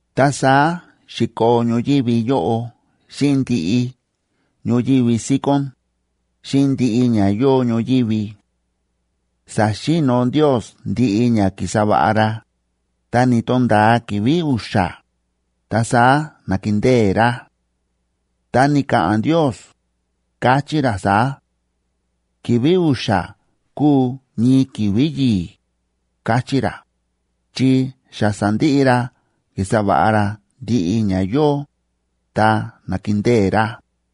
Ta saá xi̱koo ñoyívi yóꞌo xíꞌin ndiꞌi ñoyívi síkón, xíꞌin ndiꞌi ña yóo ñoyívi. Sa̱xi̱no̱ Ndios ndiꞌi ña ki̱sa va̱ꞌa ra, ta ni̱to̱nda̱a ki̱vi̱ u̱xa̱, ta saá na̱kindée ra. Ta ni̱ka̱ꞌa̱n Ndios, káchí ra saá: “Ki̱vi̱ u̱xa̱ kúu ñii ki̱vi̱ yi̱i̱”, káchí ra, chi xa sa̱ndiꞌi ra ki̱sa va̱ꞌa ra ndiꞌi ña yóo, ta na̱kindée ra.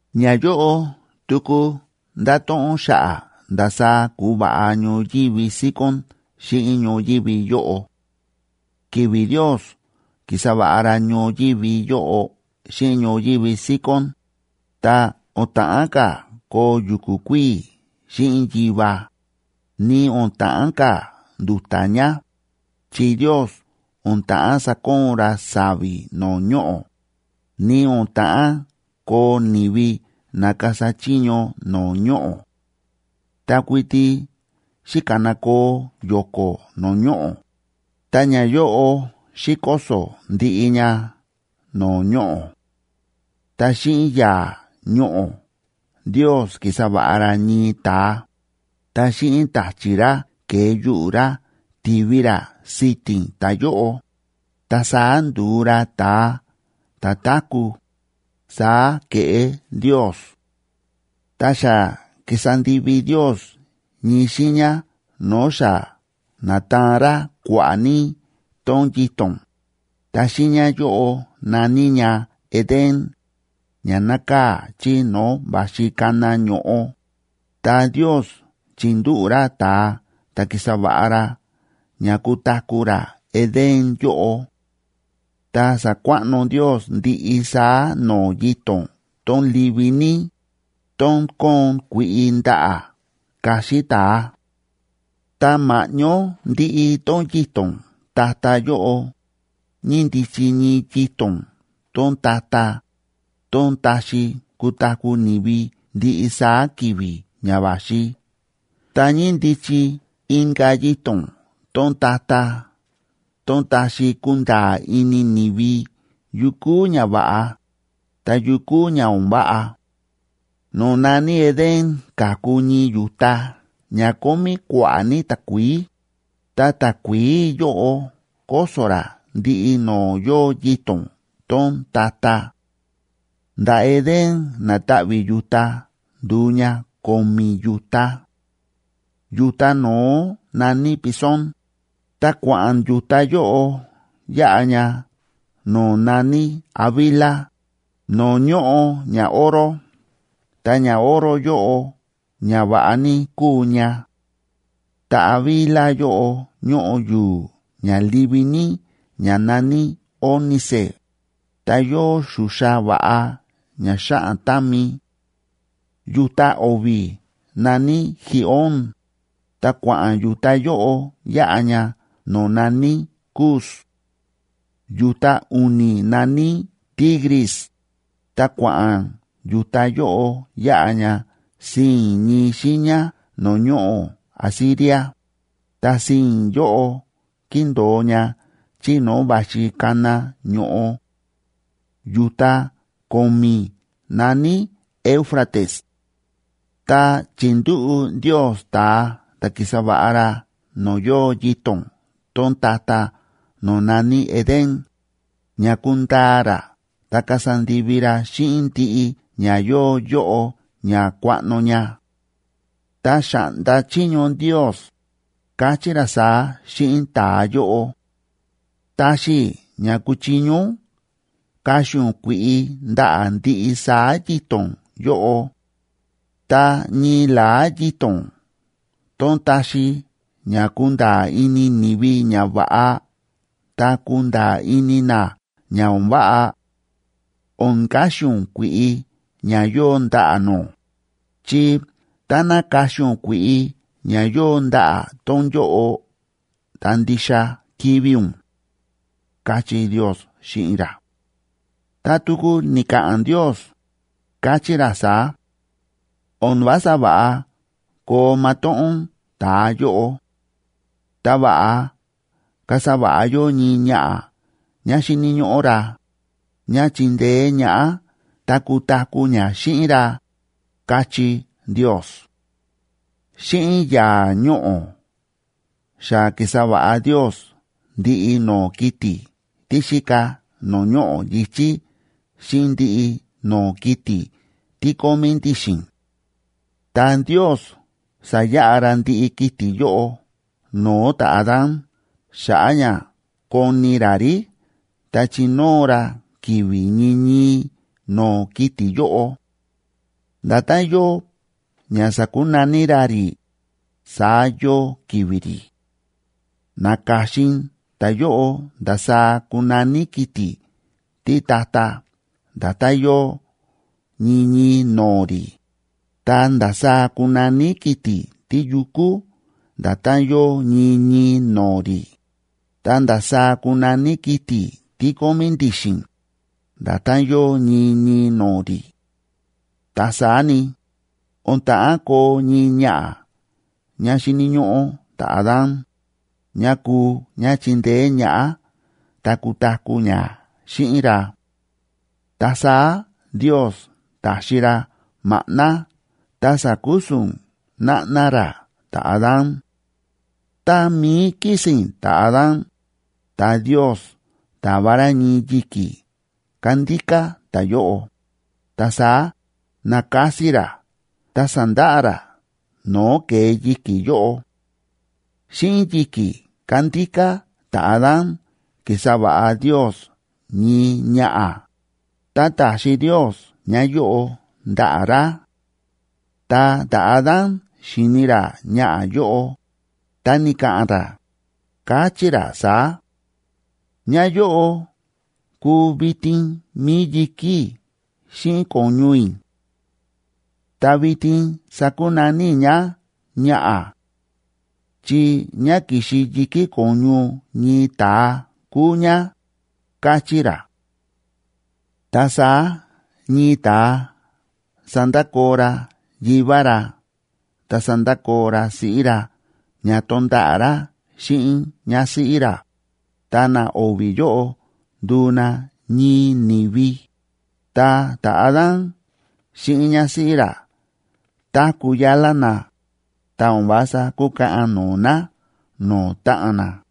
Ñayóꞌo tuku ndáto̱ꞌon xa̱ꞌa̱ ndasaá ku̱va̱ꞌa ñoyívi síkón xíꞌin ñoyívi yóꞌo. Ki̱vi̱ Ndiosa ki̱sa va̱ꞌa ra ñoyívi yóꞌo xíꞌin ñoyívi síkón, ta o̱n ta̱ꞌán ka̱ koo yu̱ku̱ kuíi̱ xíꞌin yiva, ni o̱n ta̱ꞌán ka̱ ndu̱ta̱ ña, chi Ndios o̱n ta̱ꞌán sakoon ra sa̱vi̱ no̱o̱ ñoꞌo̱, ni o̱n ta̱ꞌán koo ni̱vi na kasa chiño no̱o̱ ñoꞌo̱. Ta kuiti xi̱kanakoo yo̱ko̱ no̱o̱ ñoꞌo̱, ta ñayóꞌo xi̱koso̱ ndiꞌi ña no̱o̱ ñoꞌo̱. Ta xíꞌin yaa̱ ñoꞌo̱ Ndios ki̱sa va̱ꞌa ra ñii ta̱a, ta xíꞌin ta̱chi̱ ra ke̱e yuꞌu̱ ra ti̱vi ra si̱ti̱n ta̱yóꞌo, ta saá ndu̱u ra ta̱a ta̱ táku̱, saá ke̱ꞌé Ndios. Ta xa ki̱sa ndivi Ndios ñii xiiña no̱o̱ xa na̱taan ra kua̱ꞌa̱ ní tón yito̱n, ta xiiña yóꞌo na̱ní ña Edén, ña nákaa̱ chí no̱o̱ va̱xi kana ño̱ꞌo, ta Ndios chi̱ndúꞌu̱ ra ta̱a ta̱ ki̱sa va̱ꞌa ra ña kutaku̱ ra Edén yóꞌo. Ta sa̱kuaꞌno Ndios ndiꞌi saá no̱o̱ yito̱n tón livi ní, tón kóon kui̱ꞌi ndaꞌa̱ kaxi ta̱a. Ta ma̱ꞌñó ndiꞌi tón yito̱n ta̱ta̱ yóꞌo, ñíndichi ñii yito̱n tón ta̱ta̱ tón taxi kutaku̱ ni̱vi ndiꞌi saá ki̱vi̱ ña va̱xi, ta ñíndichi inka̱ yito̱n tón ta̱ta̱ tón taxi kunda̱a̱ ini ni̱vi yu kúu ñava̱ꞌa, ta yu kúu ña o̱n váꞌa. No̱o̱ na̱ní Edén ka̱ku ñii yu̱ta ña kómí kua̱ꞌa̱ ní takuií, ta takuií yóꞌo kóso̱ rá ndiꞌi no̱o̱ yóo yito̱n tón ta̱ta̱. Nda̱ Edén na̱ta̱ꞌvi̱ yu̱ta ndu̱u ña ko̱mi̱ yu̱ta. Yu̱ta no̱ó na̱ní Pisón, ta kua̱ꞌa̱n yu̱ta yóꞌo yáꞌa ña no̱o̱ na̱ní Havila, no̱o̱ ñóꞌo ñaoro. Ta ñaoro yóꞌo ña va̱ꞌa ní kúu ña; ta Havila yóꞌo ñóꞌo yu̱u̱ ña livi ní ña na̱ní ónice, ta yóo xuxa va̱ꞌa ña xáꞌan támi. Yu̱ta o̱vi̱ na̱ní Gihón, ta kua̱ꞌa̱n yu̱ta yóꞌo yáꞌa ña no̱o̱ na̱ní Cus. Yu̱ta u̱ni̱ na̱ní Tigris,b ta kua̱ꞌa̱n yu̱ta yóꞌo yáꞌa ña sii̱n ñii xiiña no̱o̱ ñoꞌo̱ Asiria, ta sii̱n yóꞌo kíndo̱o ña chí no̱o̱ va̱xi kana ño̱ꞌo. Yu̱ta ko̱mi̱ na̱ní Éufrates. Ta chi̱ndúꞌu̱ Ndios ta̱a ta̱ ki̱sa va̱ꞌa ra no̱o̱ yóo yito̱n tón ta̱ta̱ no̱o̱ na̱ní Edén, ña kundaa ra ta kasa ndivi ra xíꞌin ndiꞌi ña yóo yóꞌo ña kuaꞌno ña. Ta xa̱ꞌnda chiño Ndios, káchí ra saá xíꞌin ta̱a yóꞌo: ―Táxi i̱ ña kuchiño ún kaxi ún kui̱ꞌi ndaꞌa̱ ndiꞌi saá yito̱n yóꞌo. Ta ñii la̱á yito̱n tón taxi ña kunda̱a̱ ini ni̱vi ñava̱ꞌa ta kunda̱a̱ ini na ña o̱n váꞌa, o̱n kaxi ún kui̱ꞌi ña yóo ndaꞌa̱ nó. Chi táná kaxi ún kui̱ꞌi ña yóo ndaꞌa̱ tón yóꞌo, ta ndixa kivi̱ ún ―káchí Ndios xíꞌin ra. Ta tuku ni̱ka̱ꞌa̱n Ndios, káchí ra saá: “O̱n vása va̱ꞌa koo matóꞌón ta̱a yóꞌo. Ta va̱ꞌa kasa va̱ꞌa yó ñii ñaꞌa̱ ñá xíni̱ ñóꞌó ra, ñá chindeé ñaꞌá ta kutaku̱ ñá xíꞌin ra”, káchí Ndios. Xíꞌin yaa̱ ñoꞌo̱ xa ki̱sa va̱ꞌa Ndios ndiꞌi no̱o̱ kiti̱ tí xíka no̱o̱ ñoꞌo̱ yi̱chí xíꞌin ndiꞌi no̱o̱ kiti̱ tí kómí ndi̱xi̱n. Ta Ndios sa̱yaꞌa ra ndiꞌi kiti̱ yóꞌo no̱o̱ ta̱Adán xa̱ꞌa̱ ña koni ra rí ta chinóo ra ki̱vi̱ ñii ñii no̱o̱ kiti̱ yóꞌo. Nda̱tán yóo ña sa̱kunaní ra rí, saá yóo ki̱vi̱ rí. Na̱ka̱xin ta̱yóꞌo ndasaá kunaní kiti̱ títa̱ta̱ nda̱tán yóo ñii ñii no̱o̱ rí, ta ndasaá kunaní kiti̱ tíyukú nda̱tán yóo ñii ñii no̱o̱ rí, ta ndasaá kunaní kiti̱ tí kómí ndi̱xi̱n, nda̱tán yóo ñii ñii no̱o̱ rí. Ta saá ni, o̱n ta̱ꞌán koo ñii ñaꞌa̱ ñá xíni̱ ñóꞌó ta̱Adán, ñá kuu ñá chindeé ñaꞌá ta kutaku̱ ñá xíꞌin ra. Ta saá Ndios ta̱xi ra maꞌná ta sa̱kusu̱n náꞌná ra ta̱Adán. Tá mií kísi̱n ta̱Adán, ta Ndios ta̱va ra ñii yi̱kí kándíká ta̱yóꞌo, ta saá na̱kasi ra ta sa̱ndaꞌa ra no̱o̱ ke̱e yi̱ki̱ yóꞌo. Xíꞌin yi̱kí kándíká ta̱Adán ki̱sa va̱ꞌa Ndios ñii ñaꞌa̱, ta ta̱xi Ndios ñáyóꞌo ndaꞌa̱ ra. Ta ta̱Adán xi̱ni ra ñaꞌa̱ yóꞌo, ta ni̱ka̱ꞌa̱n ra, káchí ra saá: Ñáyóꞌo kúu vitin mi̱i yi̱ki̱ i̱ xíꞌin ko̱ñu i̱. Ta vitin sakunaní i̱ ñá “ñaꞌa̱”,c chi ñá ki̱xi yi̱kí ko̱ñu ñii ta̱a kúu ñá, káchí ra. Ta saá ñii ta̱a sandakoo ra yivá ra ta sandakoo ra siꞌí ra ña tonda̱ꞌa̱ ra xíꞌin ñásíꞌí ra, ta na o̱vi̱ yóꞌo nduu na ñii ni̱vi. Ta ta̱Adán xíꞌin ñásíꞌí ra táku̱ yálá na, ta o̱n vása kúkaꞌan no̱o̱ na no̱o̱ táꞌan na.